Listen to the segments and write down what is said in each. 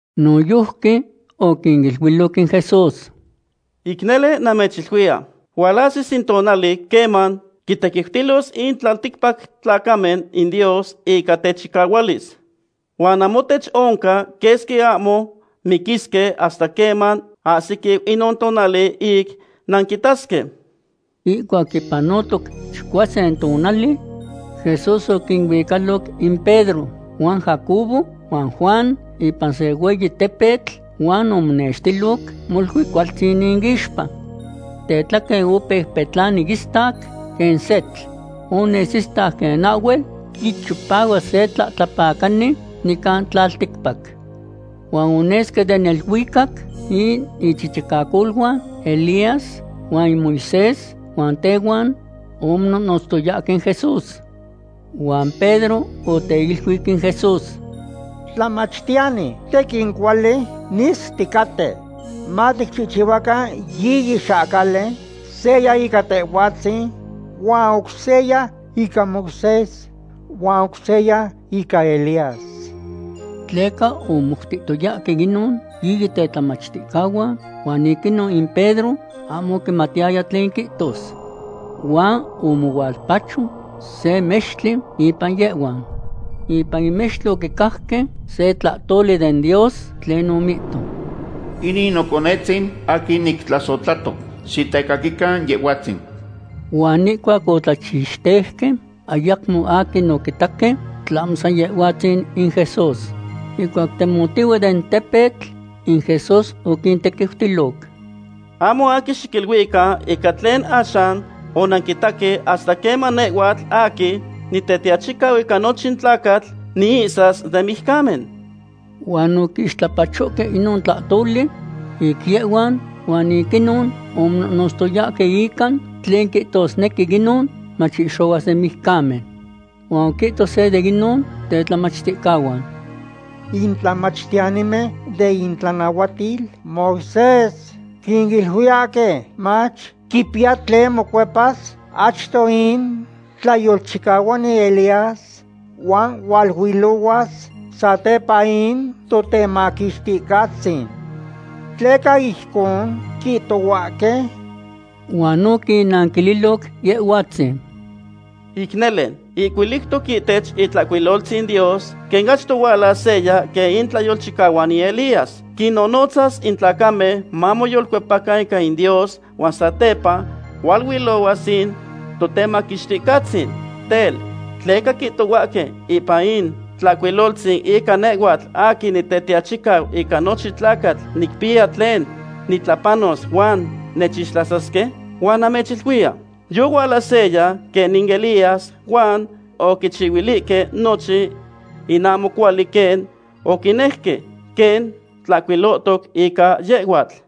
Noyojqui oquiniluiloc in Jesús: ―Ic nele namechiluiya, hualahsis in tonali queman quintequiutilos in tlalticpac tlacamen in Dios ica techicahualis. Huan namohtech oncan quesqui ahmo miquisque hasta queman ahsiquiu inon tonali ic nanquitasque. Ihcuac yipanotoc chicuasin tonali, Jesús oquinuicaloc in Pedro huan Jacobo huan Juan ipan se hueyi tepetl, huan omonextiloc molui cualtzin inixpa. Tetlaquen opeu petlani istac quen setl. Ones istac quen ahhuel quichipahuas se tlahtlapacani nican tlalticpac. Huan onesque den neluicac in ichichicacoluan Elías huan in Moisés, huan tehuan omonohnotztoyahque in Jesús. Huan Pedro oteiluic in Jesús: ―¡Tlamachtiyani, tequin cuali nis ticaten! Maticchihchihuacan yiyi xahcali, seya ica Tehhuatzin, huan oc seya ica Moisés, huan oc seya ica Elías. Tleca omomoutihtoyahque inon yiyi tetlamachticahuan huan ic inon in Pedro ahmo oquimatiyaya tlen quihtos. Huan omohualpacho se mextli impan yehhuan. Ipan in mextli oquicajque se tlahtoli den Dios tlen omihto: ―Inin noconetzin aquin nictlasohtlato. Xitecaquican Yehhuatzin. Huan ihcuac otlachixteuque, ayacmo aquin oquitaque, tlahmo san Yehhuatzin in Jesús. Ihcuac temotihue den tepetl, in Jesús oquintequiutiloc: ―Ahmo aquin xiquiluican ica tlen axan onanquitaque hasta queman nehhuatl aquin Nitetiachicau ica nochin tlacatl niihsas den mijcamen. Huan oquixtlapachohque inon tlahtoli ic yehhuan, huan ic inon omonohnotztoyahque ica tlen quihtosnequi inon, mach ihxohuas den mijcamen. Huan oquihto se de inon tetlamachticahuan: ―In tlamachtiyanimen den itlanahuatil Moisés quiluiyahque mach quipiya tlen mocuepas achto in tlayolchicahuani Elías huan hualuilohuas satepa in Totemaquixticahtzin. ¿Tleca ijcon quihtohuahque? Huan oquinnanquililoc Yehhuatzin: ―Ic nele, ihcuiliutoc ihtech Itlahcuiloltzin Dios quen achto hualas seya quen in tlayolchicahuani Elías. Quinnonotzas in tlacamen mamoyolcuepacan ica in Dios huan satepa hualuilohuas in Totemaquixticahtzin. Tel, ¿tleca quihtohuahque ipan in Tlahcuiloltzin ica nehhuatl aquin Nitetiachicau ica nochin tlacatl nicpiya tlen nitlapanos huan nechixtlasasque? Huan namechiluiya, yohuala seya quen in Elías huan oquichihuilihque nochin in ahmo cuali quen oquinejque, quen tlahcuilohtoc ica yehhuatl.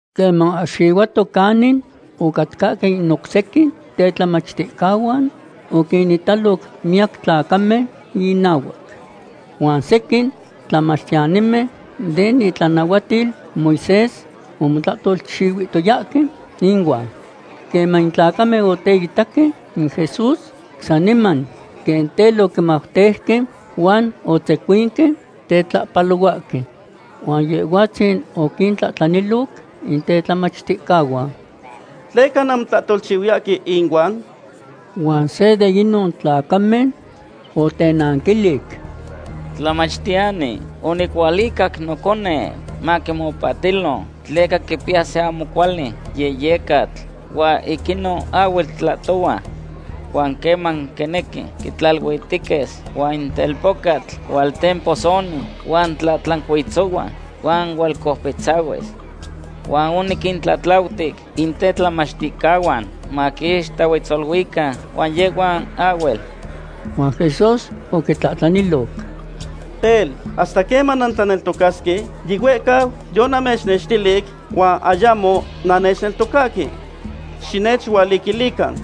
Queman oahxihuato canin ocatcahque in oc sequin tetlamachticahuan, oquinitaloc miyac tlacamen innahuac. Huan sequin tlamachtiyanimen den itlanahuatil Moisés omotlahtolchihuihtoyahque inuan. Queman in tlacamen oteitaque in Jesús, saniman quen tel oquimauteuque, huan otzecuinque tetlahpalohuahque. Huan Yehhuatzin oquintlahtlaniloc in tetlamachticahuan: ―¿Tleca nanmotlahtolchihuiyahque inuan? Huan se de inon tlacamen otenanquilic: ―Tlamachtiyani, onicualicac noconeu maquipahtilo, tleca quipiya se ahmo cuali yehyecatl huan ic inon ahhuel tlahtohua. Huan queman quinequi, quitlaluitequis, huan in telpocatl hualtemposonis huan tlahtlancuitzohuas huan hualcoupitzahuis. Huan oniquintlatlautic in tetlamachticahuan maquixtohuetzaluican, huan yehhuan ahhuel. Huan Jesús oquitlahtlaniloc: ―Tel, ¿hasta queman nantlaneltocasque? Yihuehcau yonamechnextilic huan ayamo nannechneltocahque. Xinechualiquilican.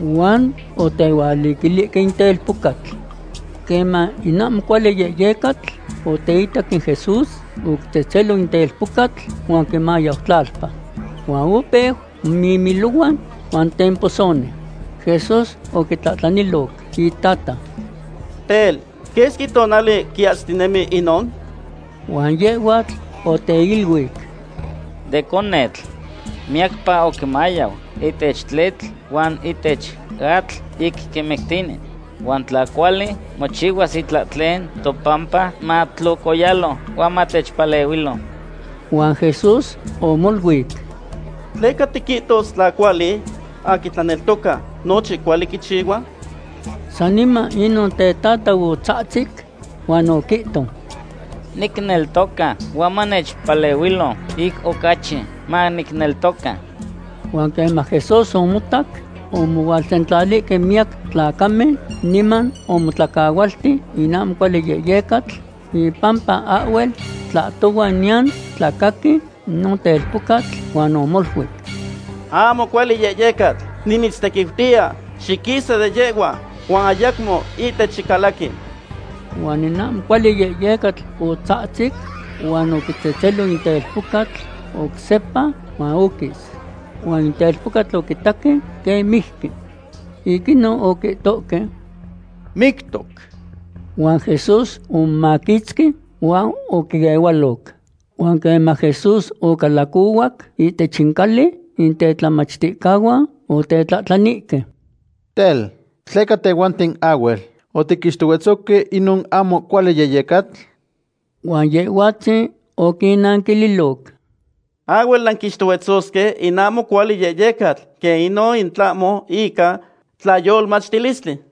Huan otehualiquilihque in telpocatl. Queman in ahmo cuali yehyecatl oteitac in Jesús, oquitzetzelo in telpocatl, huan oquimayau tlalpa. Huan opeu momimilohua huan temposoni. Jesús oquitlahtlaniloc itata: ―Tel, ¿quesqui tonali quiahsitinemi inon? Huan yehhuatl oteiluic: ―De conetl. Miyacpa oquimayau ihtech tletl huan ihtech atl ic quimictini. Huan tla cuali mochihuas itlahtlen topampa, matlocoyalo huan matechpalehuilo. Huan Jesús omoluic: ―¿Tleca tiquihtos tla cuali? Aquin tlaneltoca, nochin cuali quichihua. Saniman inon tetata otzahtzic huan oquihto: ―¡Nicneltoca, huan manechpalehuilo ic ocachi manicneltoca! Huan queman Jesús omotac omohualsentlalihque miyac tlacamen, niman omotlacahualti in ahmo cuali yehyecatl ipampa ahhuel tlahtohua niyan tlacaqui inon telpocatl, huan omoluic: ―Ahmo cuali yehyecatl, nimitztequiutiya, xiquisa de yehhua huan ayacmo ihtech xicalaqui. Huan in ahmo cuali yehyecatl otzahtzic huan oquitzetzelo in telpocatl oc sepa, huan oquis. Huan in telpocatl oquitaque quen mijqui. Ic inon oquihtohque: ―Mictoc. Huan Jesús omomaquitzqui huan oquiehualoc. Huan queman Jesús ocalacohuac ihtech in cali, in tetlamachticahuan otetlahtlanihque: ―Tel, ¿tleca tehhuanten ahhuel otiquixtohuetzohque inon ahmo cuali yehyecatl? Huan Yehhuatzin oquinnanquililoc: ―Ahhuel nanquixtohuetzosque in ahmo cuali yehyecatl quen inon in tlahmo ica tlayolmachtilistli.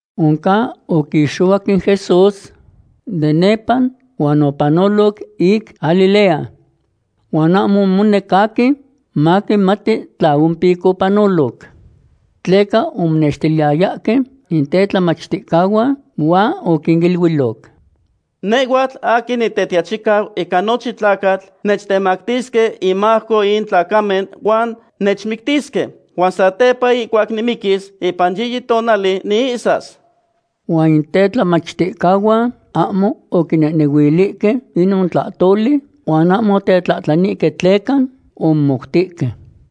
Oncan oquixohuac in Jesús de nepa huan opanoloc ic Galilea. Huan ahmo omonec aquin maquimati tla ompic opanoloc. Tleca omonextiliyayahque in tetlamachticahuan huan oquiniluiloc: ―Nehhuatl aquin Nitetiachicau ica nochin tlacatl nechtemactisque inmajco in tlacamen huan nechmictisque. Huan satepa ihcuac nimiquis, ipan yiyi tonali niihsas. Huan in tetlamachticahuan ahmo oquinehnehuilihque inon tlahtoli, huan ahmo otetlahtlanihque tleca omomoutihque.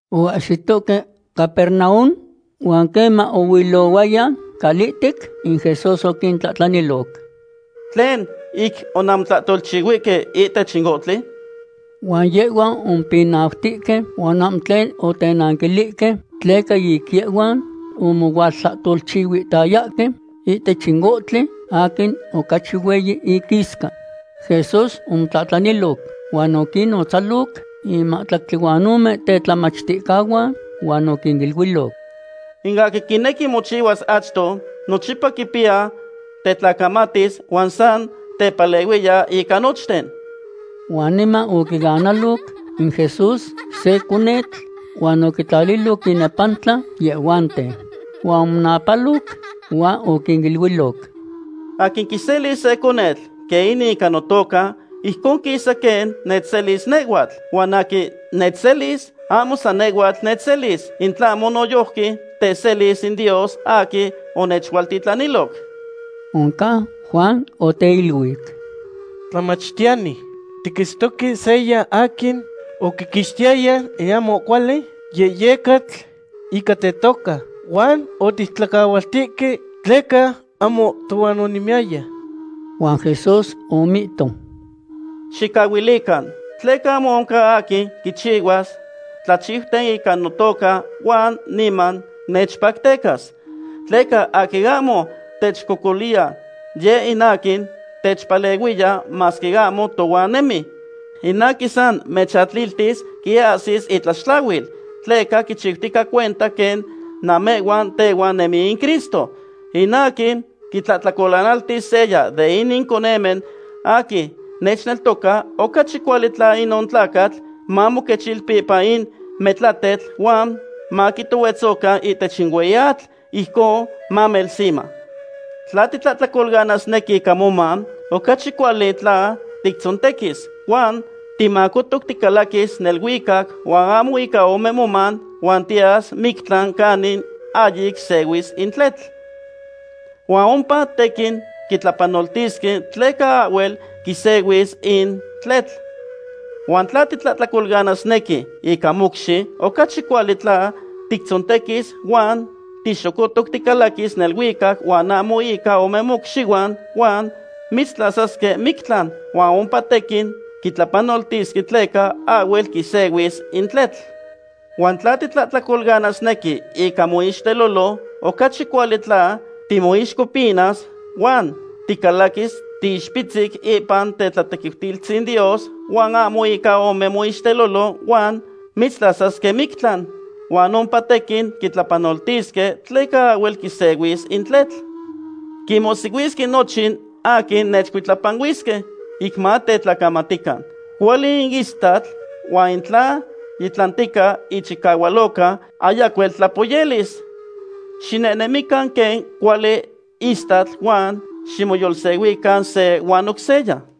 Oahsitohque Capernaum huan queman oilohuaya calihtec, in Jesús oquintlahtlaniloc: ―¿Tlen ic onanmotlahtolchihuihque ihtech in ohtli? Huan yehhuan omopinautihque huan ahmo tlen otenanquilihque, tleca ic yehhuan omohualtlahtolchihuihtayahque ihtech in ohtli aquin ocachi hueyi iquisca. Jesús omotlaliloc huan oquinnotzaloc in mahtlactli huan ome tetlamachticahuan huan oquiniluiloc: ―In aquin quinequi mochihuas achto, nochipa quipiya tetlacamatis huan san tepalehuiya ica nochten. Huan niman oquianaloc in Jesús se conetl huan oquitlaliloc inepantla yehhuanten. Huan omonapaloc huan oquiniluiloc: ―Aquin quiselis se conetl quen inin ica notoca, ijcon quisa quen nechselis nehhuatl. Huan aquin nechselis, ahmo san nehhuatl nechselis, in tlahmo noyojqui teselis in Dios aquin onechualtitlaniloc. Oncan Juan oteiluic: ―Tlamachtiyani, tiquitztoque seya aquin oquiquixtiyaya in ahmo cuali yehyecatl ica tetoca, huan otictlacahualtihque tleca ahmo tohuan onemiyaya. Huan Jesús omihto: ―Xicahuilican, tleca ahmo oncan aquin quichihuas tlachiuten ica notoca huan niman nechpactecas. Tleca aquin ahmo techcocoliya, yeh in aquin techpalehuiya masque ahmo tohuan nemi. In aquin san mechatliltis quiahsis itlaxtlahuil, tleca quichiutica cuenta quen namehhuan tehuan nemi in Cristo. ’In aquin quitlahtlacolanaltis seya de inin conemen aquin nechneltoca, ocachi cuali tla inon tlacatl mamoquechilpi ipan metlatetl huan maquitohuetzocan ihtech in hueyi atl, ijcon mamelsima. Tla titlahtlacolanasnequi ica moman, ocachi cuali tla tictzontequis, huan timacotoc ticalaquis neluicac huan ahmo ica ome moman huan tiyas mictlan canin ahyic sehuis in tletl. Huan ompa tequin quitlapanoltisque tleca ahhuel quisehuis in tletl. Huan tla titlahtlacolanasnequi ica mocxi, ocachi cuali tla tictzontequis huan tixocotoc ticalaquis neluicac huan ahmo ica ome mocxihuan huan mitztlasasque mictlan. Huan ompa tequin quitlapanoltisque tleca ahhuel quisehuis in tletl. Huan tla titlahtlacolanasnequi ica moixtelolo, ocachi cuali tla timoixcopinas. Huan ticalaquis tiixpitzic ipan tetlatequiutilistzin Dios huan ahmo ica ome moixtelolo huan mitztlasasque mictlan. Huan ompa tequin quitlapanoltisque tleca ahhuel quisehuis in tletl. ’Quinmohsihuisque nochin aquin nechcuitlapanuisque, ic matetlacamatican. Cuali in istatl, huan in tla yitlantica ichicahualoca, ayacuel tlapoyelis. Xinehnemican quen cuali istatl huan ximoyolsehuican se huan oc seya.